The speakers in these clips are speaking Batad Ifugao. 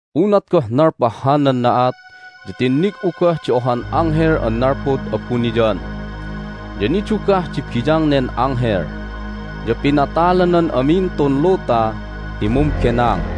Unat goh nalpah hanan na'at ya tinnig'u goh di ohan anghel an nalpud abuniyan. Ya nidugah di biyang nen anghel, ya pinatalanan amin tun luta ti mumbenang.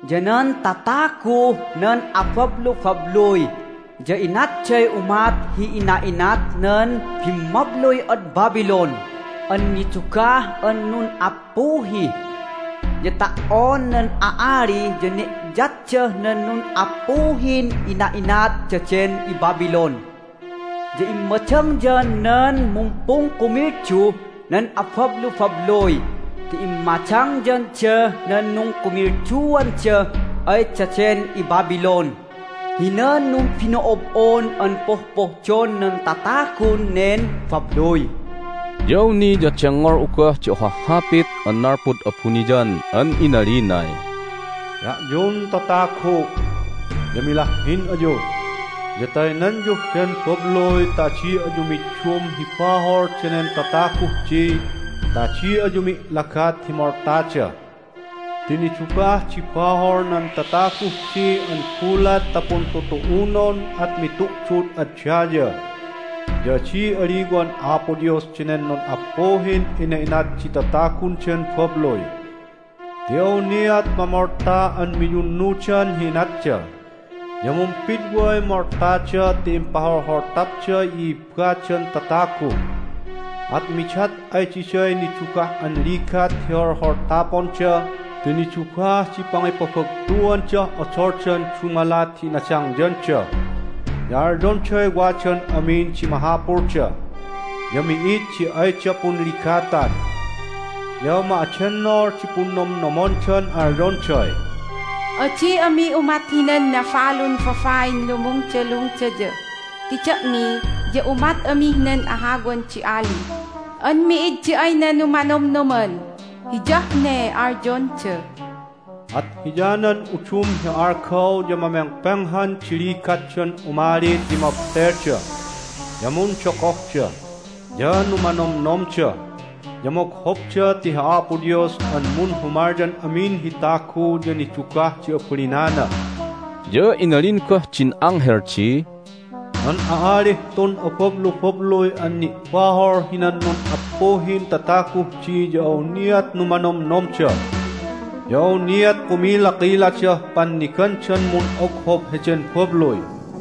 Ya nan tataguh nan abablubabluy ya inatday umat hi ina'inat nan bimmabluy ad Babylon an nidugah an nun'appuhi. Ya ta"on nan a'ali ya ne'yatdah nan nun'appuhin ina'inat daden iBabylon. Ya immadangyan nan mumpungkumilduh nan abablubabluy ti immadangyandah nan nungkumilduanda ay daden iBabylon hinan numbino'ob'on an pohpohdon nan tatagun nen babluy." Ya awni ya dengngol'u goh di ohah hapit an nalpud abuniyan an inalinay, "Da'yun tatagu' ya milahhin ayu, ya taynanyuh den babluy ta adi ayu middum hi bahol danen tataguh di ta adi ayu mi'lagat hi moltada! Ti nidugah di bahol nan tataguh di an gulat ta puntutu'unon at mitu'dud ad daya, ya adi aliwan Apo Dios danen nun'appuhin ina'inat di tatagun den babluy! Ti awniat mamolta an miyunnudan hi inatda, ya mumpidway moltada ti impaholholtapday i'ibbadan tatagu! At midat ay diday nidugah an ligat hi holholtaponda ti nidugah di pangipabagtuandah odoldan dumalat hi inadangyanda, ya alyonday wadan amin di mahapulda, ya mi'id di ayda punligatan. Ya ma'adennol di punnomnomdan alyonday, Adi ami umat hinan nabalun babain lumungdalungdaya ti da'mi ya umat amih nan ahawan di ali an mi'id di ayna numanonomnoman. Hiyah ne alyonda. At hiyanan udum hi algaw ya mamengpenghan di ligatdan umali ti mabtelda, ya mundogohda, ya numanomnomda, ya moghobda ti hi Apo Dios an munhumalyan amin hi tagu ya nidugah di abalinana." Ya inalin goh din anghel di, "Nan a'alih tun abablubabluy an ni'bahol hinan nun'appuhin tataguh di ya awniat numanomnomda, ya awniat kumilakiladah pannigandan mun'oghob heden babluy.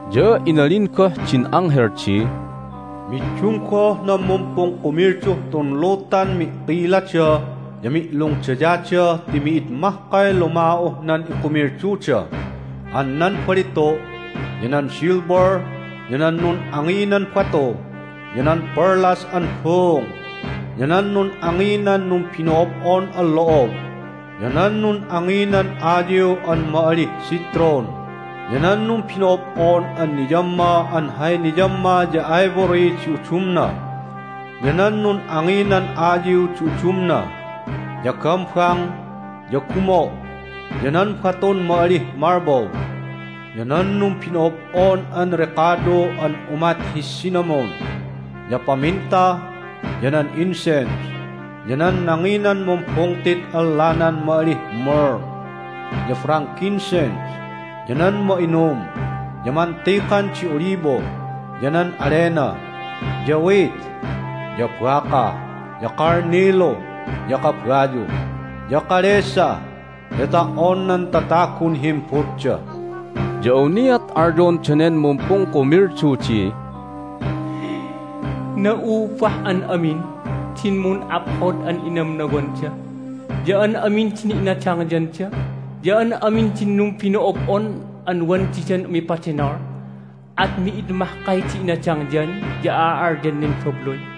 Ya inalin goh din anghel di, "Middum goh nan mumpungkumilduh tun lutan mi'kilada ya mi'lungdayada ti mi'id mahkay luma'uh nan ikumilduda an nan balitu', ya nan silver, ya nan nun'anginan batu, ya nan perlas an buung, ya nan nun'anginan numbino'ob'on an lo'ob, ya nan nun'anginan ayiw an ma'alih citron, ya nan numbino'ob'on an niyamma an hay niyamma ya ivory di udumna, ya nan nun'anginan ayiw di udumna, ya gambang, ya gumo', ya nan batun ma'alih marble, ya nan numbino'ob'on an rekado an umat hi cinnamon, ya paminta, ya nan incense, ya nan nanginan mumbungtit an lanan ma'alih myrrh ya frankincense, ya nan ma'inum, ya mantikan di olibo, ya nan alena, ya wheat, ya baka, ya kalnilu, ya kabayu, ya kalesa, ya ta"on nan tatagun himbutda. Ya awniat alyon danen mumpungkumildu di, Na'ubah an amin din mun'aphod an inamnawanda, ya an amin din inadangyanda, ya an amin din numbino'ob'on an wan didan umipadenol. At mi'id mahkay di inadangyan ya a'al'alyan nen babluy!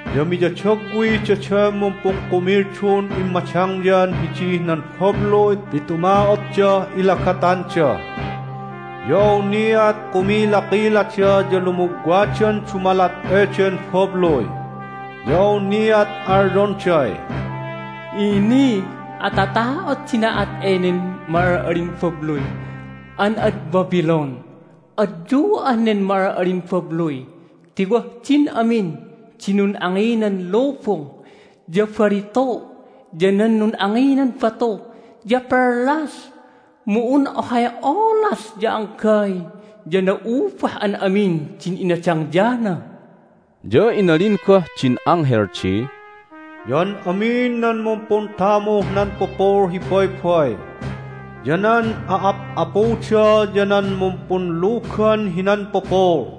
Ya miyadagwi daden mumpungkumildun immadangyan hidih nan babluy ti tuma'otdah ilagatanda. Ya awniat kumilakilada ya lumugwadan dumalat eden babluy, ya awniat alyonday, Ini! Atata'ot di na'at enen ma'al'alin babluy an ad Babylon! Adyu'ah nen ma'al'alin babluy ti wah din amin di nun'anginan lubung, ya balitu', ya nan nun'anginan batu, ya perlas! Mu un ohay olas ya anggay ya na'ubah an amin din inadangyana!" Ya inalin goh din anghel di, "Ya an amin nan mumpuntamuh nan pupul hi baybay, ya nan a'ap'apuda, ya nan numpunlugan hinan pupul,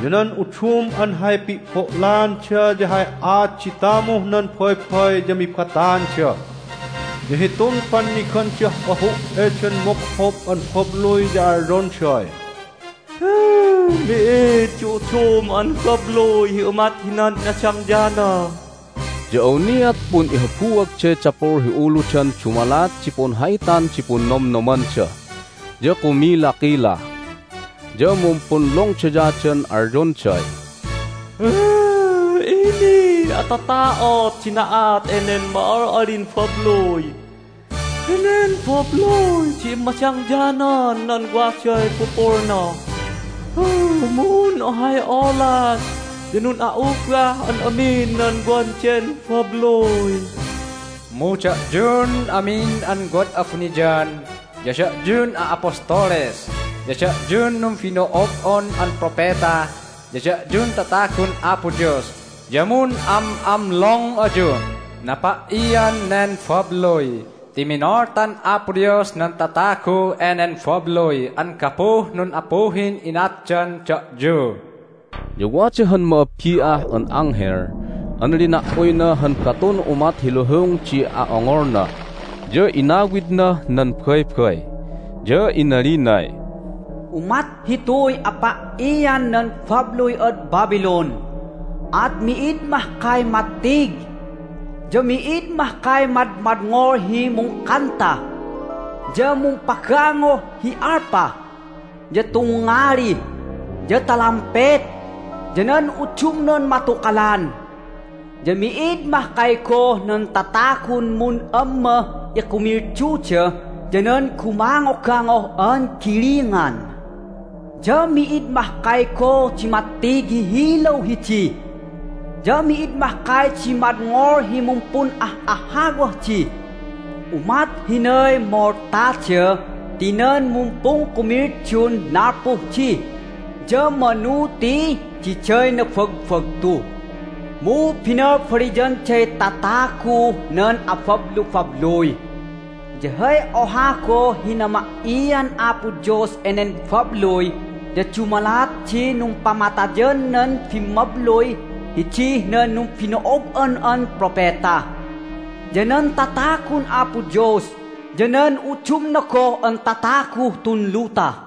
ya nan udum an hay pi'bo'laanda ya hay aat di tamuh nan baybay ya mibataanda. Ya hitun pannigandah ahu' eden moghob an babluy ya alyonday, Mi'id di udum an babluy hi umat hinan inadangyana! Ya awniat pun'ihabuagday dapul hi uludan dumalat di punha'itan di punnomnomanda, ya kumilakila, ya mumpunlungdayadan alyonday, Ini! Atata'ot di na'at enen ma'al'alin babluy! Henen babluy di immadangyanan nan waday pupulna, mu un ohay olas ya nun'a'ubah an amin nan wan den babluy! Mu da'yun amin an wad abuniyan, ya da'yun a'apostoles, ya da'yun numbino'ob'on an propeta, ya da'yun tatagun Apo Dios ya mun'am'amlong ayuh napa"ian nen babluy! Ti minoltan Apo Dios nan tatagu enen babluy an gapuh nun'appuhin inatdan da'yu!" Ya wada han ma'abbi'ah an anghel an lina"uyna han batun umat hi luhung di a'ongolna, ya inawidnah nan baybay, ya inalinay, "Umat hituy apa"ian nan babluy ad Babylon, at mi'id mahkay mattig! Ya mi'id mahkay madmadngol hi mungkanta, ya mumpagangoh hi alpa, ya tungngali, ya talampet, ya nan udumnan matukalan! Ya mi'id mahkay goh nan tatagun mun'ammah ikumilduda ya nan gumangogangoh an gilingan! Ya mi'id mahkay goh di mattig hi hilaw hidi, ya mi'id mahkay di madngol hi mumpun'ah'ahawah di. Umat hinay moltada ti nan mumpungkumildun nalpuh di ya manu ti diday nabagbagtu, mu binalbaliyanday tataguh nan abablubabluy! Ya hay oha goh hi nama"ian Apo Dios enen babluy ya dumalat di numpamatayan nan bimmabluy hidih nan numbino'ob'on an propeta, ya nan tatagun Apo Dios, ya nan udumna goh an tataguh tun luta."